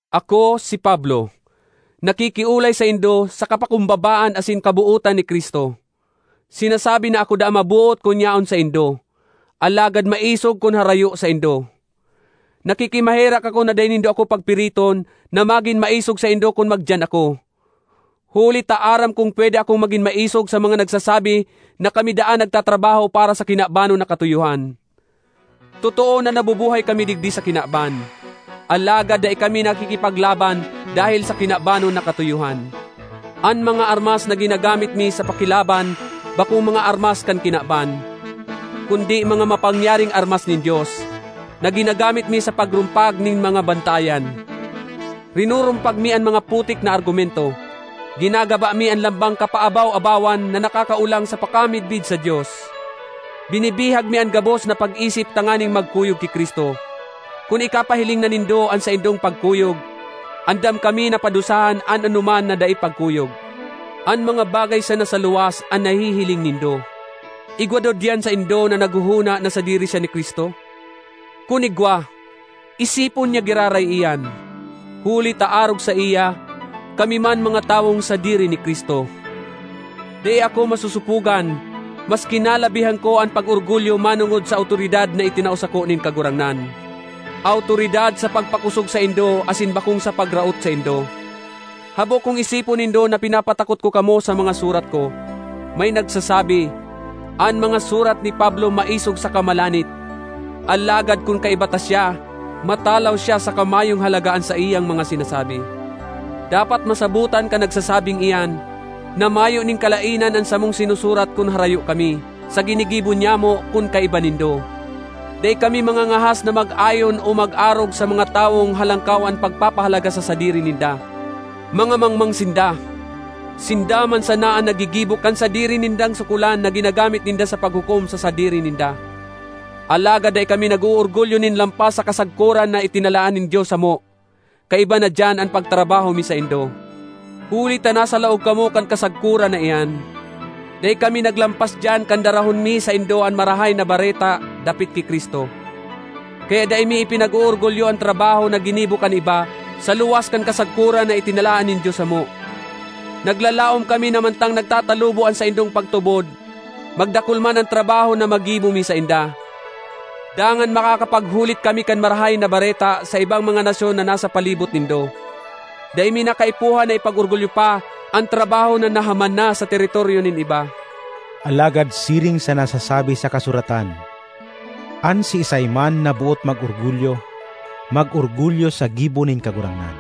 Ako, si Pablo, nakikiolay saindo sa kapakumbabaan asin sa kabootan ni Cristo. Sinasabi na ako daa maboot kun yaon saindo, alagad maisog kun harayo saindo. Nakikimaherak ako na dai nindo ako pagpiriton na magin maisog saindo kun magdiyan ako; huli ta aram kong pwede akong magin maisog sa mga nagsasabi na kami daa nagtatrabaho para sa kinabanon na katuyohan. Totoo na nabubuhay kami digdi sa kinaban, alagad dai kami nakikipaglaban dahel sa kinabanon na katuyohan. An mga armas na ginagamit mi sa pakilaban bakong mga armas kan kinaban, kundi mga mapangyaring armas nin Dios, na ginagamit mi sa pagrumpag nin mga bantayan. Rinurumpag mi an mga putik na argumento; ginagaba mi an lambang kapaabaw-abawan na nakakaolang sa pakamidbid sa Dios; binibihag mi an gabos na pag-isip tanganing magkuyog ki Cristo. Kun ikapahiling na nindo an saindong pagkuyog, andam kami na padusahan an anoman na dai pagkuyog. An mga bagay sana sa luwas an nahihiling nindo. Igwa daw diyan saindo na naghohona na sadiri siya ni Cristo? Kun igwa, isipon niya giraray iyan, huli ta arog saiya, kami man mga tawong sadiri ni Cristo. Dai ako masosopogan, maski nalabihan ko an pag-orgulyo manongod sa awtoridad na itinao sako nin Kagurangnan—awtoridad sa pagpakosog saindo asin bakong sa pagraot saindo. Habo kong isipon nindo na pinapatakot ko kamo sa mga surat ko. May nagsasabi, “An mga surat ni Pablo maisog saka malanit, alagad kun kaiba ta siya, matalaw siya saka mayong halaga an saiyang mga sinasabi!” Dapat masabotan kan nagsasabing iyan na mayo nin kalaenan an samong sinusurat kun harayo kami, sa ginigibo nyamo kun kaiba nindo. Dai kami mangangahas na mag-ayon o mag-arog sa mga tawong halangkaw an pagpahalaga sa sadiri ninda. Mga mangmang sinda! Sinda man sana an naggigibo kan sadiri nindang sukolan na ginagamit ninda sa paghukom sa sadiri ninda! Alagad dai kami nag-oorgulyo nin lampas sa kasagkoran na itinalaan nin Dios samo; kaiba na diyan an pagtrabaho mi saindo. Huli ta nasa laog kamo kan kasagkoran na iyan, dai kami naglampas diyan kan darahon mi saindo an Marahay na Bareta dapit ki Cristo. Kaya dai mi ipinag-oorgulyo an trabaho na ginibo kan iba sa luwas kan kasagkoran na itinalaan nin Dios samo. Naglalaom kami na mantang nagtatalubo an saindong pagtubod, magdakul man an trabaho na magibo mi sainda. Dangan makakapaghulit kami kan Marahay na Bareta sa ibang mga nasyon na nasa palibot nindo; dai mi na kaipuhan na ipag-orgulyo pa an trabaho na nahaman na sa teritoryo nin iba. Alagad siring sa nasasabi sa kasuratan, “An siisay man na boot mag-orgulyo, mag-orgulyo sa gibo nin Kagurangnan.”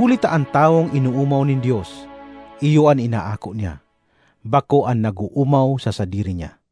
Huli ta an tawong inoomaw nin Dios iyo an inaako niya, bako an nag-oomaw sa sadiri niya.